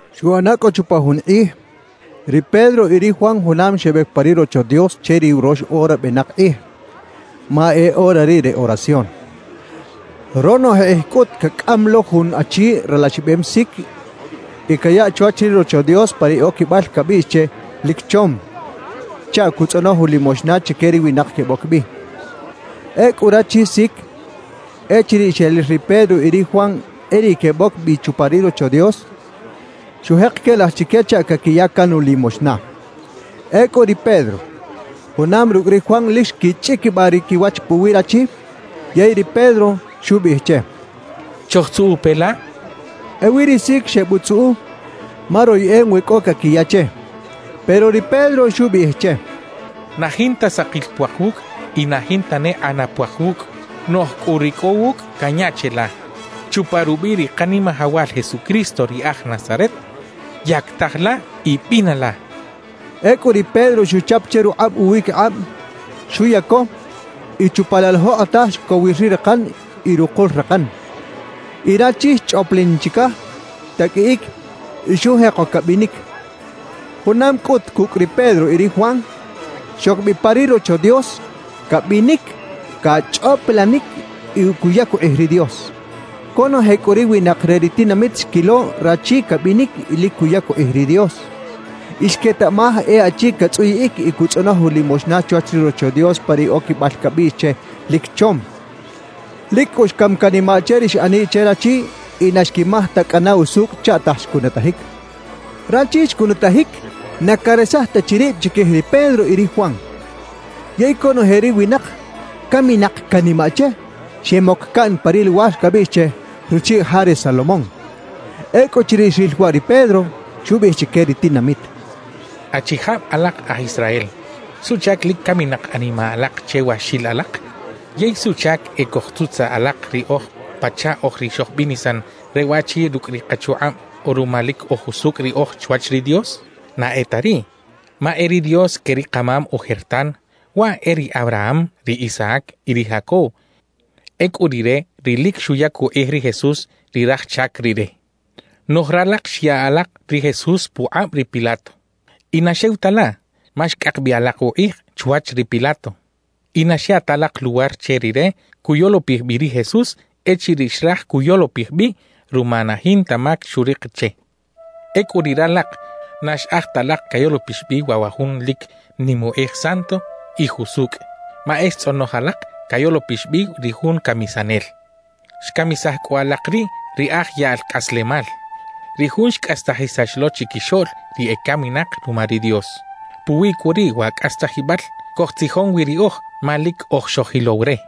Xuꞌana cꞌu chupa jun kꞌij, ri Pedro y ri Juan junam xebec pa ri Rocho Dios che ri urox ora benak kꞌij, ma e ora riꞌ re oración. Ronoje kꞌij cꞌut cacꞌam lo jun achi ralaxibem sic y cayaꞌ chwach ri Rocho Dios pa ri oquibal cabiꞌx che “Lic Chom” chaꞌ cutzꞌonoj ulimoxna chique ri winak queboc bi. Ecꞌu rachi sic, echiriꞌ xeril ri Pedro y ri Juan e riꞌ queboc bi chupa ri Rocho Dios, xujek quelaj chique chaꞌ caquiya can ulimoxna. Ecꞌu ri Pedro junam rucꞌ ri Juan lic xquichꞌiquibaꞌ ri quiwach puwi rachi, yey ri Pedro xubiꞌij che: —Chojtzuꞌu pe la —xcha che. Ewi ri sic xebutzuꞌu ma royeꞌem we cꞌo caquiya che. Pero ri Pedro xubiꞌij che: —Na jinta sakil puak wucꞌ y na jinta ne kꞌana puak wucꞌ; noꞌj cꞌu ri cꞌo wucꞌ canya cheꞌla. Chupa rubiꞌ ri Kanimajawal Jesucristo ri aj Nazaret, yactaj la y bina la —xcha che. Ecꞌu ri Pedro xuchap che rukꞌab uwiquikꞌab, xuyaco y chupa laꞌ la jokꞌotaj xcowir ri rakan y rukul rakan. Y rachi xchꞌoplin chicaj, xtaqꞌuiꞌic y xujeko cabinic. Junam cꞌut cucꞌ ri Pedro y ri Juan, xoc bi pa ri Rocho Dios, cabinic, cachꞌoplanic y cuyac ukꞌij ri Dios. Conoje cꞌu ri winak re ri tinamit xquilo rachi cabinic y lic cuyac ukꞌij ri Dios. Y xquetaꞌmaj e achi catzꞌuyiꞌic y cutzꞌonoj ulimoxna chwach ri Rocho Dios pa ri oquibal cabiꞌx che “Lic Chom”. Lic cꞌu xcam canimaꞌ che ri xꞌaniꞌ che rachi y na xquimaj ta cꞌana usucꞌ chaꞌtaj xcunutajic. Rachi xcunutajic na caresaj ta chi rib chiquij ri Pedro y ri Juan. Yey conoje ri winak caminak canimaꞌ che, xemoc caꞌn pa ri luwar cabiꞌx che “Ruchiꞌ Ja re Salomón”. Ecꞌuchiriꞌ xril waꞌ ri Pedro, xubiꞌij chique ri tinamit: «Achijab alak aj Israel, ¿suꞌchac lic caminak animaꞌ alak che wa xil alak? ¿Yey suꞌchac e cojtzutzaꞌ alak riꞌoj pachaꞌ oj ri xojbinisan re waꞌchi rucꞌ ri kachukꞌab o ruma lic oj jusucꞌ riꞌoj chwach ri Dios? Na e ta riꞌ. Ma e ri Dios que ri kamam ojertan, waꞌ e ri Abraham, ri Isaac y ri Jacob, ecꞌu Rire ri lic xuyac ukꞌij ri Jesús ri Raj Chac Rire. Noꞌj ralak xya alak ri Jesús pukꞌab ri Pilato. Y na xew ta laꞌ, ma xcꞌak bi alak ukꞌij chwach ri Pilato y na xya ta alak luwar che rire cuyolopij bi ri Jesús echiriꞌ xraj cuyolopij bi ruma na jinta mac xurik che. Ecꞌu riꞌ ralak na xꞌaj ta alak cayolopix bi waꞌ wa Jun lic nim ukꞌij Santo y Jusucꞌ; ma e xtzꞌonoj alak cayolopix bi ri jun camisanel. Xcamisaj cꞌu alak riꞌ ri aj yaꞌl cꞌaslemal, ri Jun xcꞌastajisax lo chiquixoꞌl ri ecaminak ruma ri Dios. Puwi cꞌu riꞌ wa cꞌastajibal cojtzijon wi riꞌoj ma lic oj xojilow re.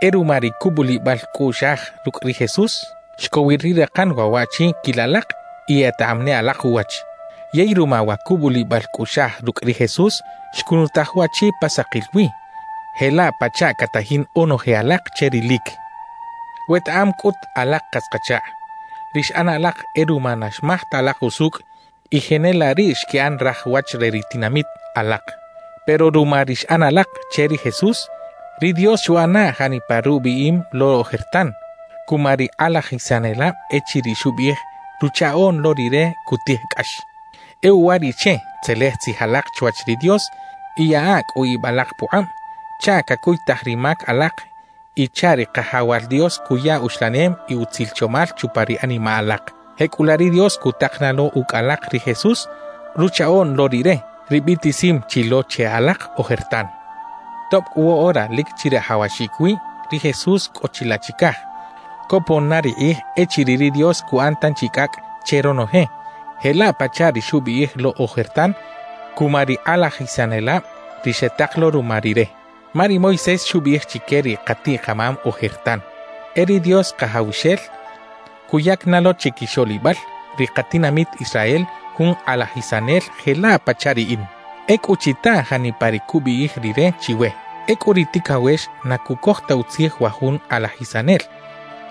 »E ruma ri cubulibal cꞌuꞌxaj rucꞌ ri Jesús, xcowir ri rakan waꞌ waꞌchi quil alak y etaꞌam ne alak uwach. Yey ruma wa cubulibal cꞌuꞌxaj rucꞌ ri Jesús xcunutaj waꞌchi pa sakil wi jelaꞌ pachaꞌ catajin onoje alak che rilic. »Wetaꞌam cꞌut, alak katz-kachakꞌ, ri xꞌan alak e ruma na xmaj ta alak usucꞌ, y jenelaꞌ riꞌ xquiꞌan raj wach re ri tinamit alak. Pero ruma ri xꞌan alak che ri Jesús, ri Dios xuꞌana janipa rubiꞌim lo ojertan cuma ri kꞌalajisanelab echiriꞌ xubiꞌij Ruchaꞌoꞌn lo Rire cutij cꞌax. »E uwariꞌche tzelej tzij alak chwach ri Dios y yaꞌa cꞌu ib alak pukꞌab chaꞌ cacuytaj ri mac alak y chaꞌ ri Kajawal Dios cuya uxlanem y utzil chomal chupa ri animaꞌ alak. Jecꞌulaꞌ ri Dios cutak na lo ucꞌ alak ri Jesús, Ruchaꞌoꞌn lo Rire, ri biꞌtisim chi lo che alak ojertan. Tob cꞌu woꞌora lic chirajawaxic wi ri Jesús cꞌo chilaꞌ chicaj, copon na ri kꞌij echiriꞌ ri Dios cuꞌan tanchi cꞌacꞌ che ronoje jelaꞌ pachaꞌ ri xubiꞌij lo ojertan cuma ri kꞌalajisanelab ri xetak lo ruma Rire. »Ma ri Moisés xubiꞌij chique ri katiꞌ-kamam ojertan: E ri Dios Kajawxel cuyac na lo chiquixoꞌlibal ri katinamit Israel jun Kꞌalajisanel jelaꞌ pachaꞌ riꞌin. Ecꞌu chita janipa ri cubiꞌij Rire chiwe. Ecꞌu ri ticawex na cucoj ta utzij wa jun Kꞌalajisanel,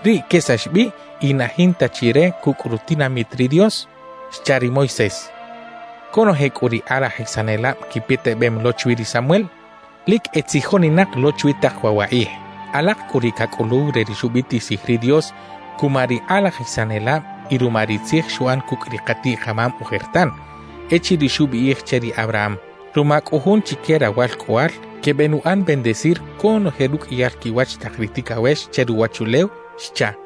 riꞌ quesax bi y na jinta chi re cucꞌ rutinamit ri Dios xcha ri Moisés. »Conoje cꞌu ri kꞌalajisanelab quipetebem lo chwi ri Samuel, lic etzijoninak lo chwi tak waꞌ wa kꞌij. Alak cꞌu ri cacꞌuluw re ri xubiꞌtisij ri Dios cuma ri kꞌalajisanelab y ruma ri tzij xuꞌan cucꞌ ri katiꞌ-kamam ojertan, echiriꞌ xubiꞌij che ri Abraham: Ruma cꞌu Jun chique rawalcꞌoꞌal, quebenuꞌan bendecir conoje ruqꞌuiyal quiwach tak ri ticawex che ruwachulew xchaꞌ.